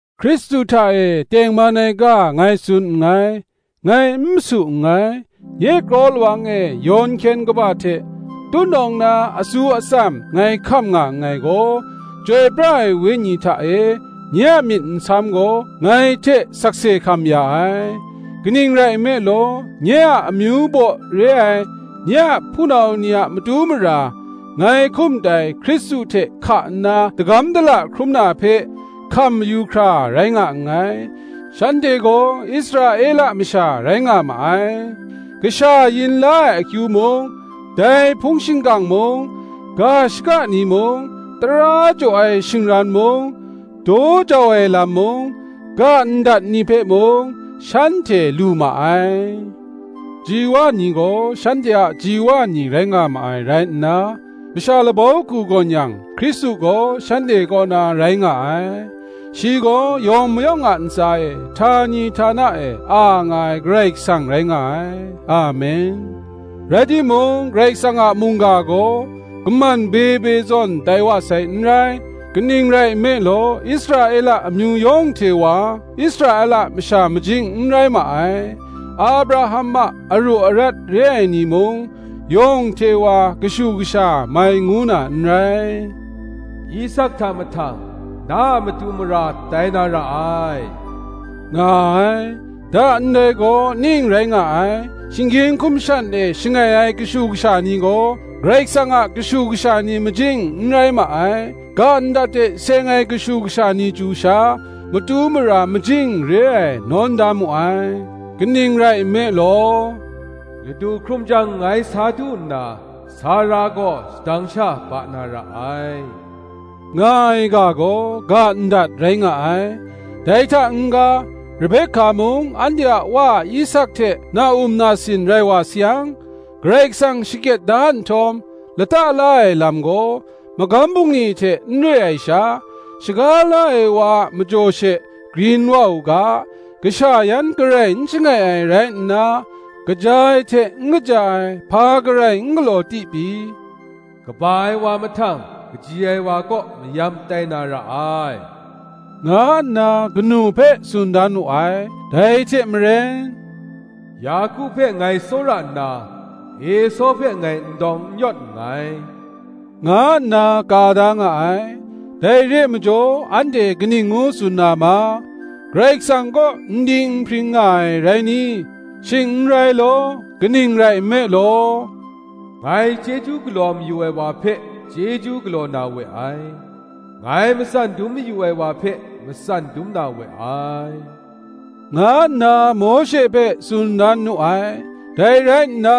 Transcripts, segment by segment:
Hkristu hta e tengman ai ga ngai tsun nngai, ngai n masu nngai; nye kraw lawang e yawn hkyen kaba hte tutnawng na atsu atsam ngai hkam nga nngai gaw, Chyoi pra ai Wenyi hta e nye a myit nsam gaw, ngai hte sakse hkam ya ai. Kaning rai nme law, nye a amyu baw re ai, nye a hpunau ni a matu mara, ngai hkum dai Hkristu hte hka nna dagam dala hkrum na hpe, hkam mayu hkra rai nga nngai: shanhte gaw Israela masha rai nga ma ai; kasha yin la ai akyu mung, dai hpung shingkang mung, ga shaka ni mung, tara jaw ai shingran mung, daw jau ai lam mung, ga ndat ni hpe mung, shanhte lu ma ai: ji wa ni gaw shanhte a ji wa ni rai nga ma ai rai nna, masha labau hku gawn yang, Hkristu gaw shanhte kaw na rai nga ai; shi gaw yawng mayawng a ntsa e htani htana e a nga ai Karai Kasang rai nga ai. Amen. Rai timung, Karai Kasang a mungga gaw kaman be be zawn tai wa sai n rai. Kaning rai nme law, Israela amyu yawng hte wa, Israela masha majing n rai ma ai: Abraham a aru arat re ai ni mung, yawng hte wa kashu kasha mai ngu na n rai. Isak hta mahtang, na a matu mara tai na ra ai, nga ai. Da ndai gaw ning rai nga ai: shinggyim hkum shan e shangai ai kashu kasha ni gaw, Karai Kasang a kashu kasha ni majing n rai ma ai; ga ndat hte seng ai kashu kasha ni chyu sha, matu mara majing re ai nawn da mu ai. Kaning rai nme law, Ladu hkrum jang ngai sa du nna Sara gaw shadang sha ba na ra ai, nga ai ga gaw, ga ndat rai nga ai. Dai hta n-ga, Rebeka mung anhte a wa Isak hte na-um nasin rai wa sayang, Karai Kasang shakyet da nhtawm, lata la ai lam gaw, magam bungli hte n re ai sha, shaga la ai wa a majaw she grin wa u ga, kasha yan garai n shangai ai rai nna, kaja ai hte n kaja ai hpa garai n galaw ti pyi, Kaba ai wa mahtang kaji ai wa kaw mayam tai na ra ai, nga nna kanu hpe tsun dan wu ai. Dai hte maren, Yaku hpe ngai tsawra nna, Esaw hpe ngai n dawng n yawt nngai, nga nna ka da nga ai. Dai re ai majaw anhte kaning ngu tsun na ma? Karai Kasang kaw n ding n hpring nga ai rai ni? Shing n rai law. Kaning rai nme law, Ngai chyeju galaw mayu ai wa hpe chyeju galaw na we ai; ngai matsan dum mayu ai wa hpe matsan dum na we ai, nga nna Mawshe hpe tsun dan nu ai. Dai rai nna,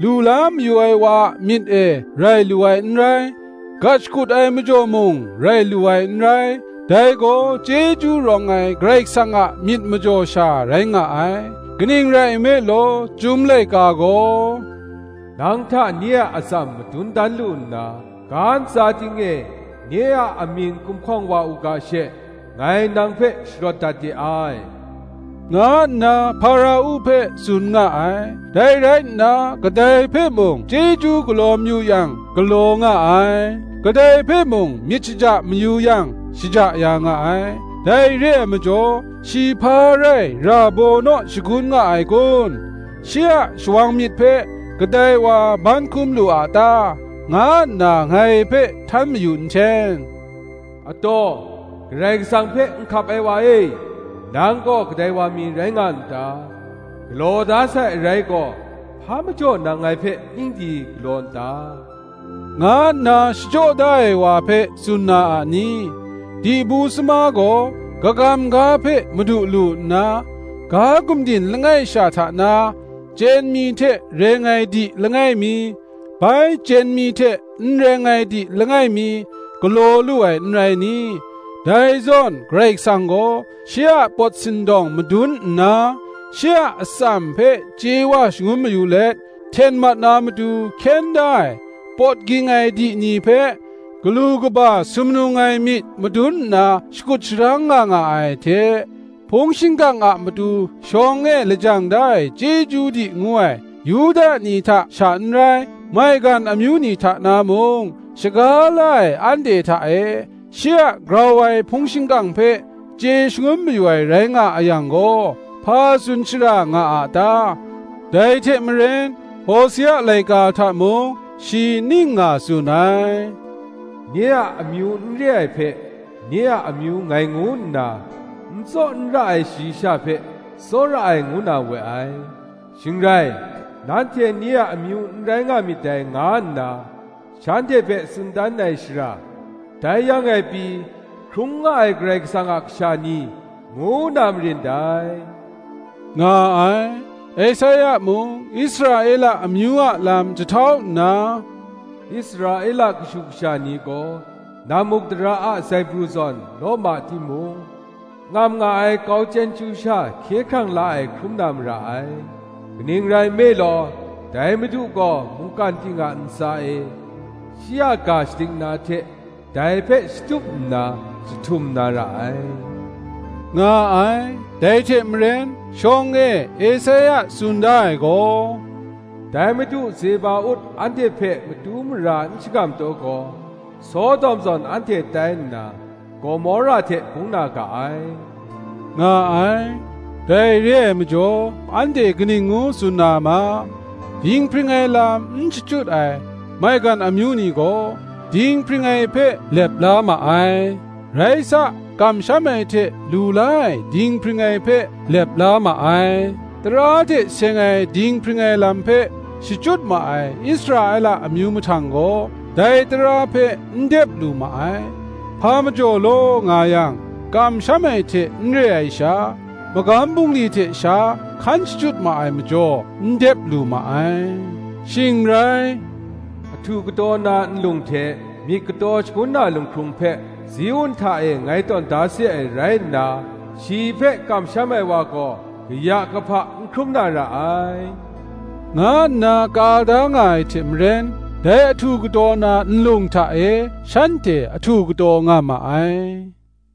lu la mayu ai wa a myit e rai lu ai n rai, gat shakut ai majaw mung rai lu ai n rai, dai gaw chyeju rawng ai Karai Kasang a myit majaw sha rai nga ai. Kaning rai nme law, Chyum laika gaw, Nang hta nye a atsam madun dan lu nna, ga ntsa ting e nye a amying gumhkawng wa u ga she, ngai nang hpe sharawt dat de ai, nga nna Hpara-u hpe tsun nga ai. Dai rai nna, kadai hpe mung, chyeju galaw mayu yang galaw nga ai, kadai hpe mung myit shaja mayu yang, shaja ya nga ai. Dai re ai majaw, Shi hpa rai ra baw naw shagun nga ai kun? shi a shawang myit hpe kadai wa ban hkum lu a ta? nga nna ngai hpe htan mayu nhten. Ataw, Karai Kasang hpe nhkap ai wa e, nang gaw kadai wa mi rai nga n ta? Galaw da sai arai gaw, Hpa majaw nang ngai hpe ning di galaw n ta? nga nna shachyaw da ai wa hpe tsun na a ni? Di bu sama gaw kagam ga hpe madu lu nna, ga gumdin langai sha hta na, chyen mi hte reng ai di langai mi, bai chyen mi hte n reng ai di langai mi, galaw lu ai n rai ni? Dai zawn Karai Kasang gaw, shi a pawt sindawng madun nna, shi a atsam hpe chye wa shangun mayu let, hten mat na matu hkyen da ai pawt ging ai di ni hpe galu kaba sumnung ai myit madun nna shakut sharang nga nga ai hte; hpung shingkang a matu shawng e lajang da ai chyeju di ngu ai, Yuda ni hta sha n rai, maigan amyu ni hta na mung, shaga la ai anhte hta e, shi a grau ai hpung shingkang hpe chye shangun mayu ai rai nga a yang gaw, hpa tsun shara nga a ta? Dai hte maren Hosea laika hta mung shi ning nga tsun ai, “Nye a amyu n re ai hpe, nye a amyu ngai ngu nna, N tsaw n ra ai shayi sha hpe, tsawra ai ngu na we ai;” Shing rai, “Nanhte nye a amyu n rai nga myit dai, nga nna shanhte hpe tsun dan ai shara, dai yang e pyi, Hkrung nga ai Karai Kasang a kasha ni ngu na marin dai,” nga ai. Esaia mung Israela amyu a lam jahtau nna, Israela kashu kasha ni gaw nammukdara a zaibru zawn law ma timung, ngam nga ai kau chyen chyu sha hkye hkrang la ai hkrum na mara ai. Kaning rai nme law, dai Madu gaw mungkan ting a ntsa e, shi a ga shadik na hte dai hpe shatup nna jahtum na ra ai, nga ai. Dai hte maren, shawng e Esaia tsun da ai gaw, “Dai Madu Zeba-ut anhte hpe matu mara n shangam taw gaw, Sodom zawn anhte tai nna, Gomora hte bung na ga ai,” nga ai. Dai re ai majaw anhte kaning ngu tsun na ma? Dinghpring ai lam n shachyut ai maigan amyu ni gaw, dinghpring ai hpe lep la ma ai; rai sa, kamsham ai hte lu la ai dinghpring ai hpe lep la ma ai: tara hte seng ai dinghpring ai lam hpe shachyut ma ai Israela amyu mahtang gaw, dai tara hpe n dep lu ma ai. Hpa majaw law nga yang, kamsham ai hte n re ai sha, magam bungli hte sha hkan shachyut ma ai majaw n dep lu ma ai. Shing rai, “Ahtu kataw na nlung hte, myit kataw shangun na lunghkrung hpe, Ziun hta e ngai tawn da se ai rai nna, Shi hpe kamsham ai wa gaw, kaya kahpa n hkrum na ra ai,” nga nna ka da nga ai hte maren, dai ahtu kataw na nlung hta e shanhte ahtu kataw nga ma ai.